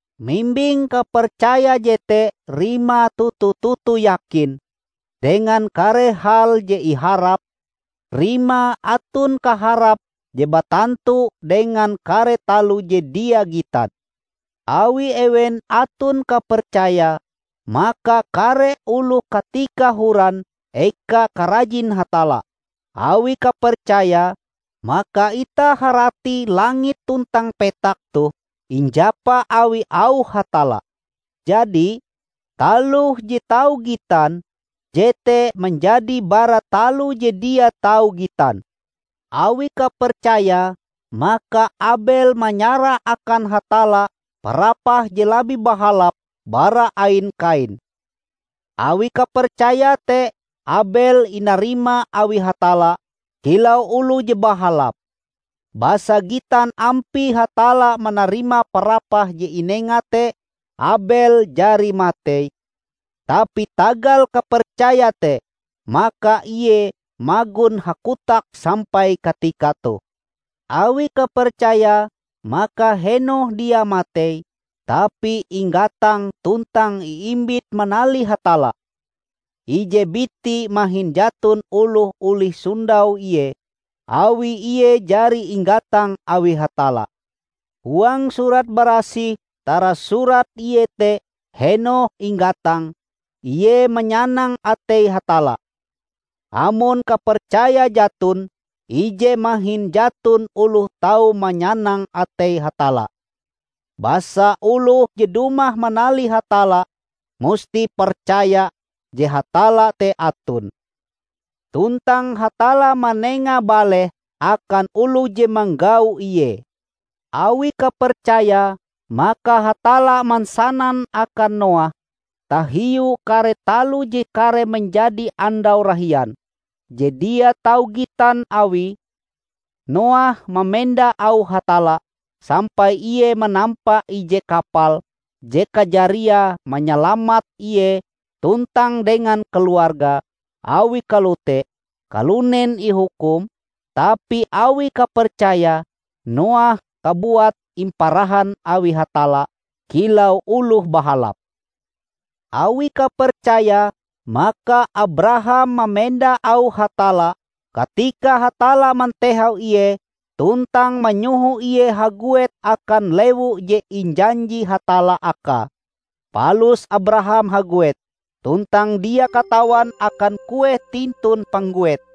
Mimbing kapercaya jete rimae toto-toto yakin dengan kare hal je iharap, rimae aton kaharap je batantu dengan kare taloh je dia gitan. Awi ewen aton kapercayae, maka kare oloh katika horan eka karajin Hatalla. Awi kapercaya, maka itah harati langit tuntang petak toh injapa awi auh Hatalla; jadi, taloh je tau gitan, jete manjadi bara taloh je dia tau gitan. Awi kapercayae, maka Abel manyarah akan Hatalla parapah je labih bahalap bara ain Kain. Awi kapercayae te, Abel inarima awi Hatalla kilau oloh je bahalap, basa gitan ampie Hatalla manarima parapah je inenga te. Abel jari matei, tapi tagal kapercayae te, maka ie magon hakotak sampai katika toh. Awi kapercayae, maka Henokh dia matei, tapi inggatang tuntang iimbit manalih Hatalla. Ije biti mahin jaton oloh olih sondau ie, awi ie jari inggatang awi Hatalla. Huang Surat Barasih tarasurat iete Henokh inggatang, ie manyanang atei Hatalla. Amon kapercaya jaton, ije mahin jaton oloh tau manyanang atei Hatalla. Basa oloh je dumah manalih Hatalla musti percaya je Hatalla te aton, tuntang Hatalla manenga baleh akan oloh je manggau Ie. Awi kapercayae, maka Hatalla mansanan akan Noah tahiu kare taloh je kareh manjadi andau rahian, je dia tau gitan awie. Noah mamenda auh Hatalla sampai ie manampa ije kapal je kajariae manyalamat ie tuntang dengan keluargae. Awi kalote, kalunen ihukum, tapi awi kapercayae, Noah kabuat imparahan awi Hatalla kilau oloh bahalap. Awi kapercayae, maka Abraham mamenda auh Hatalla katika Hatalla mantehau ie tuntang manyoho ie haguet akan lewu je injanji Hatalla akae. Palus Abraham haguet tuntang dia katawan akan kueh tintun pangguete.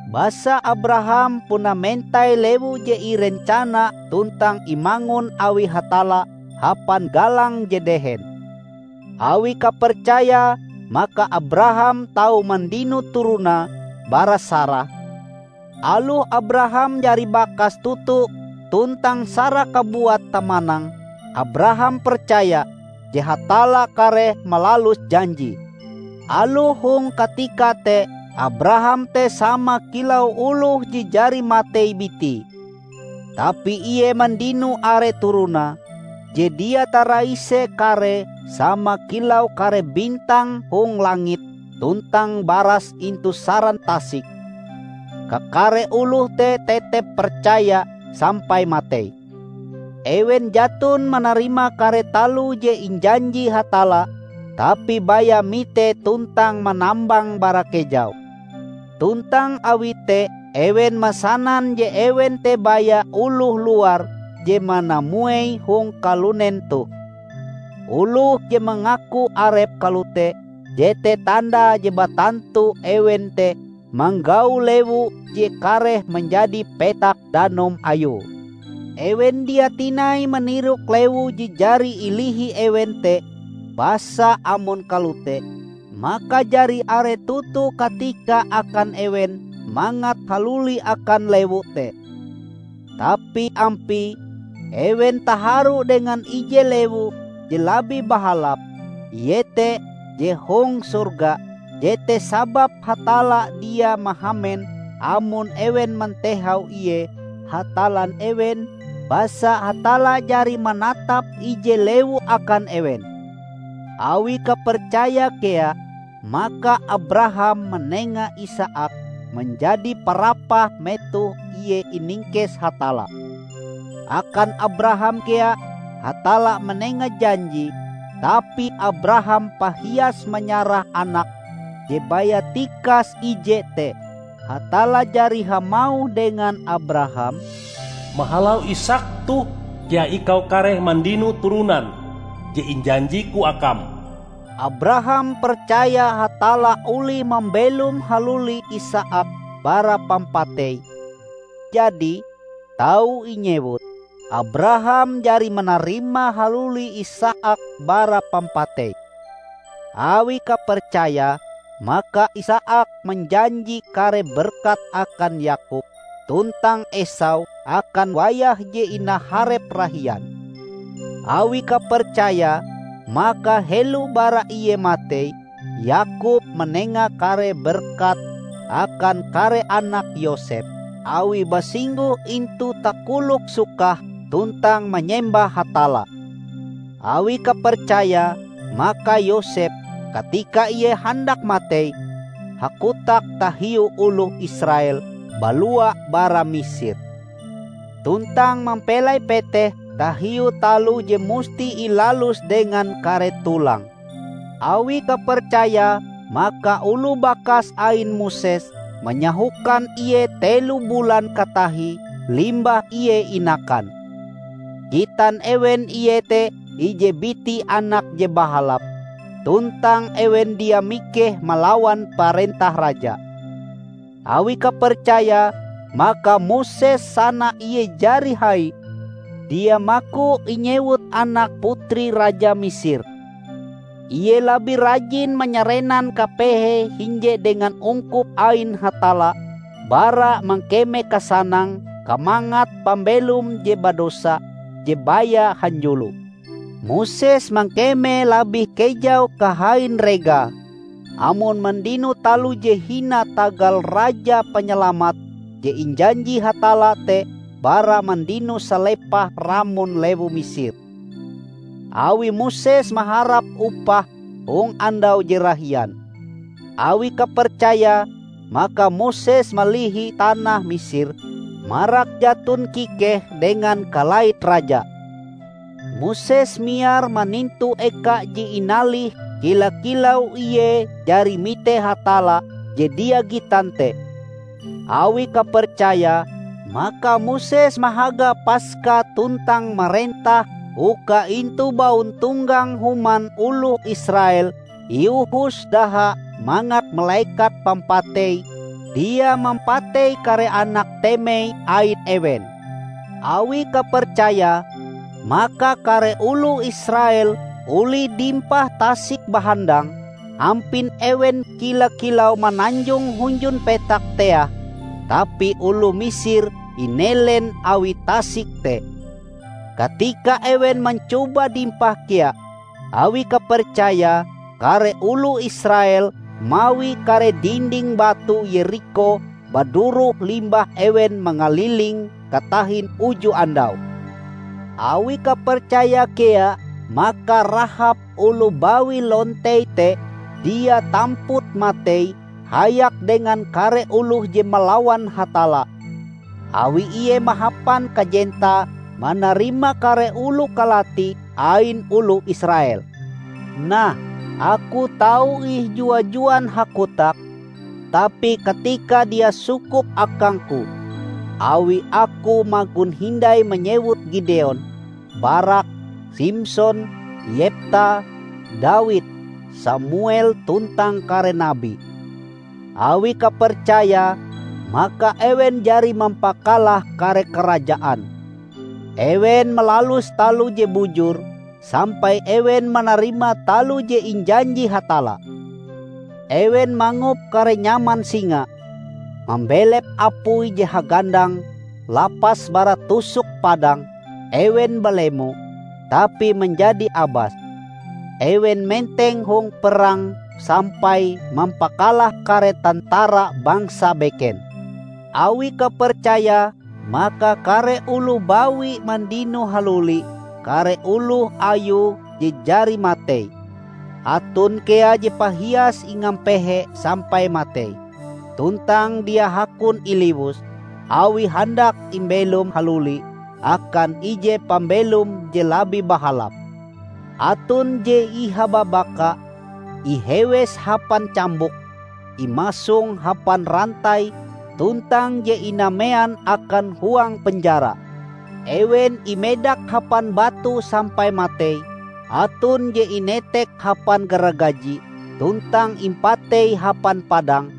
Basa Abraham puna mentai lewu je irencana tuntang imangun awi Hatalla hapan galang je dehen. Awi kapercayae maka Abraham tau mandino turonae bara Sarah, aloh Abraham jari bakas toto, tuntang Sarah kabuat tamanang. Abraham percaya je Hatalla kareh malalus janjie. Aloh hong katika te Abraham te sama kilau oloh je jari matei bitie, tapi ie mandino are turonae, je dia taraise karee -- sama kilau kare bintang hong langit tuntang baras intu saran tasik. Kakare oloh te tetep percaya sampai matei. Ewen jaton manarima kare taloh je injanji Hatalla, tapi baya mite tuntang manambange bara kejau. Tuntang awi te ewen mansanan je ewen te baya oloh luar je manamuei hong kalunen toh. Oloh je mangaku arepe kalote jete tandae je batantu ewen te manggau lewu je kareh manjadi petak danum ayue. Ewen dia tinai manirok lewu je jari ilihi ewen te. Basa amon kalote, maka jari are toto katika akan ewen mangat haluli akan lewu te. Tapi ampie, ewen taharu dengan ije lewu je labih bahalap, iete je hong sorga. Jete sababe Hatalla dia mahamen amon ewen mantehau ie Hatallan ewen, basa Hatalla jari manatap ije lewu akan ewen. Awi kapercayae kea, maka Abraham manenga Isaak manjadi parapah metoh ie iningkes Hatalla. Akan Abraham kea Hatalla manenga janjie, tapi Abraham pahias manyarah anake je baya tikas ije te. Hatalla jari hamauh dengan Abraham, "Mahalau Isaak toh kea ikau kareh mandino turonan je injanji-Ku akam." Abraham percaya Hatalla olih mambelom haluli Isaak bara pampatei -- jadi, tau inyewut, Abraham jari manarima haluli Isaak bara pampatei. Awi kapercayae, maka Isaak manjanji kare berkat akan Yakob tuntang Esau akan wayah je inaharep rahian. Awi kapercayae, maka helo bara ie matei, Yakob manenga kare berkate akan kare anak Yosep -- awie basingguh intu takolok sukahe tuntang manyembah Hatalla. Awi kapercayae, maka Yosep -- katika ie handak matei -- hakotak tahiu oloh Israel balua bara Misir, tuntang mampelai peteh tahiu taloh je musti ilalus dengan kare tulange. Awi kapercayae, maka oloh bakas ain Moses manyahokan ie telo bulan katahie limbah ie inakan. Gitan ewen ie te ije biti anak je bahalap, tuntang ewen dia mikeh malawan parentah raja. Awi kapercayae, maka Moses sana ie jari hai, dia maku inyewut anak putri raja Misir. Ie labih rajin manyarenan kapehe hinje dengan ungkup ain Hatalla bara mangkeme kasanang kamangat pambelom je badosa je baya hanjulo. Moses mangkeme labih kejau kahain regae amon mandino taloh je hina tagal Raja Panyalamat je injanji Hatalla te bara mandino salepah ramon lewu Misir, awi Moses maharap upah hong andau je rahian. Awi kapercayae, maka Moses malihi tanah Misir marak jaton kikehe dengan kalait raja. Moses miar manintu eka je inalihe kila-kilau ie jari mite Hatalla je dia gitan te. Awi kapercayae, maka Moses mahaga Paska tuntang marentah uka intu bauntonggang human oloh Israel iohos daha mangat Malekat Pampatei dia mampatei kare anak temei ain ewen. Awi kapercayae, maka kare oloh Israel olih dimpah Tasik Bahandang, ampin ewen kila-kilau mananjong hunjun petak teah, tapi oloh Misir inelen awi tasik te, katika ewen mancoba dimpah kea. Awi kapercayae, kare oloh Israel mawi kare dinding batu Yerikho baduroh limbah ewen mangalilinge katahin uju andau. Awi kapercayae kea, maka Rahab oloh bawi lontei te dia tamput matei hayak dengan kare oloh je malawan Hatalla; awi ie mahapan kajentae manarima kare oloh kalati ain oloh Israel. Nah, aku tau ih jua-juan hakotak, tapi katika dia sukup akangku. Awi aku magon hindai manyewut Gideon, Barak, Simson, Yepta, Dawid, Samuel tuntang kare nabi. Awi kapercayae, maka ewen jari mampakalah kare karajaan. Ewen malalus taloh je bujur, sampai ewen manarima taloh je injanji Hatalla. Ewen mangop kare nyaman singa, mambelep apui je hagandang, lapas bara tusuk padang. Ewen balemo, tapi manjadi abas; ewen menteng hong perang sampai mampakalah kare tentara bangsa beken. Awi kapercayae, maka kare oloh bawi mandino haluli kare oloh ayue je jari matei. Aton kea je pahias ingapehe sampai matei, tuntang dia hakon iliwus, awie handak imbelom haluli akan ije pambelom je labih bahalap. Aton je ihababaka, ihewes hapan cambuk, imasong hapan rantai tuntang je inamean akan huang penjara. Ewen imedak hapan batu sampai matei, aton je inetek hapan garagaji tuntang impatei hapan padang.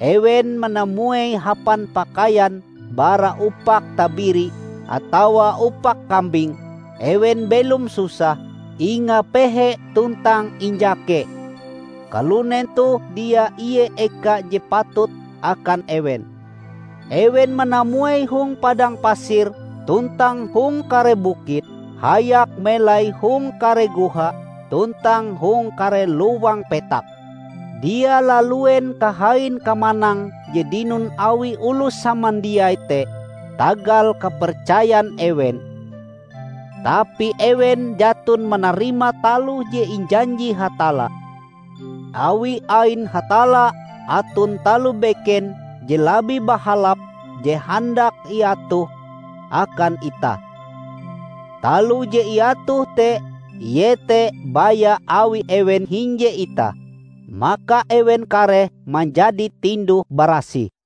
Ewen manamuei hapan pakaian bara upak tabiri atawa upak kambing; ewen belom susah, ingapehe tuntang injake. Kalunen toh dia ie eka je patut akan ewen. Ewen manamuei hong padang pasir tuntang hong kare bukit, hayak melai hong kare goha tuntang hong kare lowang petak. Dia laluen kahain kamanang je dinon awi oloh samandiai te tagal kapercayan ewen! Tapi ewen jaton manarima taloh je injanji Hatalla, awi ain Hatalla aton taloh beken je labih bahalap je handak iatohe akan itah. Taloh je iatohe te iete baya awi ewen hinje itah, maka ewen kareh manjadi tinduh-barasih.